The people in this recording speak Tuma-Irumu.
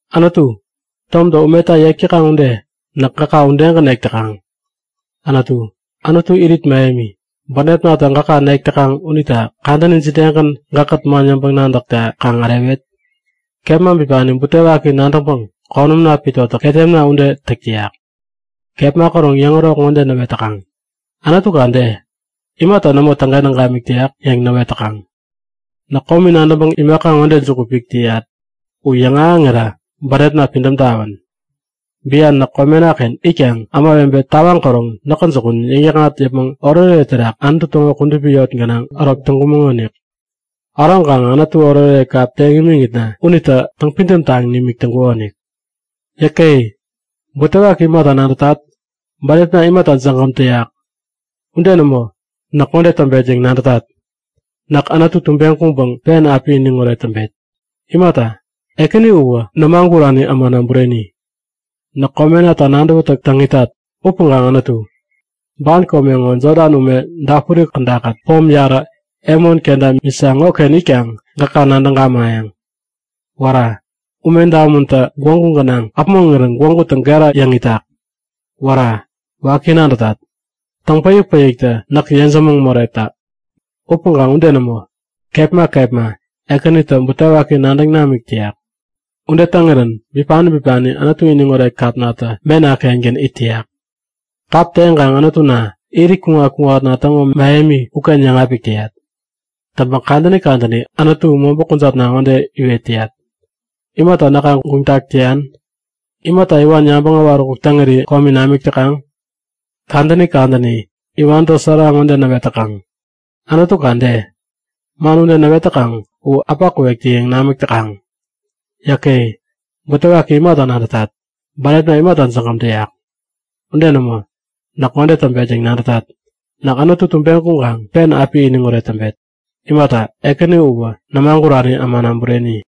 Anutu, tomtä umeta yek täkaŋ ude, näk gäka udegän nek täkaŋ. Anutu, Anutu irit mähemi, bänepnatä gäka nek täkaŋ unita kadäni jidegän gäkkät man yäŋpäŋ-nadäkta kaŋ ärewet? Kepma bipani butewaki nadäŋpäŋ konämna pitotä ketemna ude täk täyak. Kepma käroŋ yäŋärok ŋode näwet täkaŋ; Anutuka de? Imata nämo täŋkentäŋ gamik täyak? yäŋ näwet täkaŋ. Näk komi nadäŋpäŋ imaka ŋode juku pik täyat u yäŋahäŋira bänepna pidäm tawän! Bian näk komenaken itkaŋ ämawebe tawaŋ käroŋ näkä jukun yäŋ-yäkŋat yäpmäŋ oretoret terak Anutu täŋo kudupi yot gänaŋ ärok täŋkumäŋonik. Äroŋkaŋä Anututa oretoret kap teŋ imiŋitna unitä täŋpidäm taŋ nimik täŋkukonik. Yäke! Butewaki imata nadätat? Bänepna imata jägäm täyak? Ude nämo! Näk ŋode täŋpet yäŋ nadätat; Näk Anutu tubeŋ kuŋkaŋ pen api iniŋoret täŋpet! Imata, Ekänina uwä nämagurani ämana bureni! Näk komenata nadäwätäk täŋ itat. Upäŋkaŋ Anutu, ban kome ŋo Jodan ume dapuri kädakät pom yarä Hemon kenta Misa ŋoken itkaŋ gäka nadäŋ gamayäŋ. Wära! Ume damuntä gwägu gänaŋ äpmoŋirän gwägutä gera yäŋ itak. Wära! Waki nadätat! Täŋpäik-päikkatä näk yejämäŋ moretak. Upäŋkaŋ ude nämo! Kepma kepma Ekänitä butewaki nadäŋ namik täyak. Ude täŋirän bipani bipani Anutu iniŋoret kapnatä mena-kengän it täyak. Kap teŋkaŋ Anutuna, irit kuŋat-kuŋatna täŋo mähemi uken yäŋapik täyat. Täŋpäŋ kadäni kadäni Anutu, mobä kujatna ŋode iwet täyat; Imata näka guŋtak täyan? Imata iwan yabäŋ äwaräkuk täŋiri komi namik täkaŋ? Kadäni kadäni iwantä sära ŋode näwet täkaŋ; Anutuka de? Man ude näwet täkaŋ u äpa kuwektä-yäŋ namäk täkaŋ. Yäke! Butewaki imata nadätat? Bänepna imata jägäm täyak? Ude nämo! Näk ŋode täŋpet yäŋ nadätat; Näk Anutu tubeŋ kuŋkaŋ pen api iniŋoret täŋpet! Imata, Ekänina uwä nämagurani ämana bureni!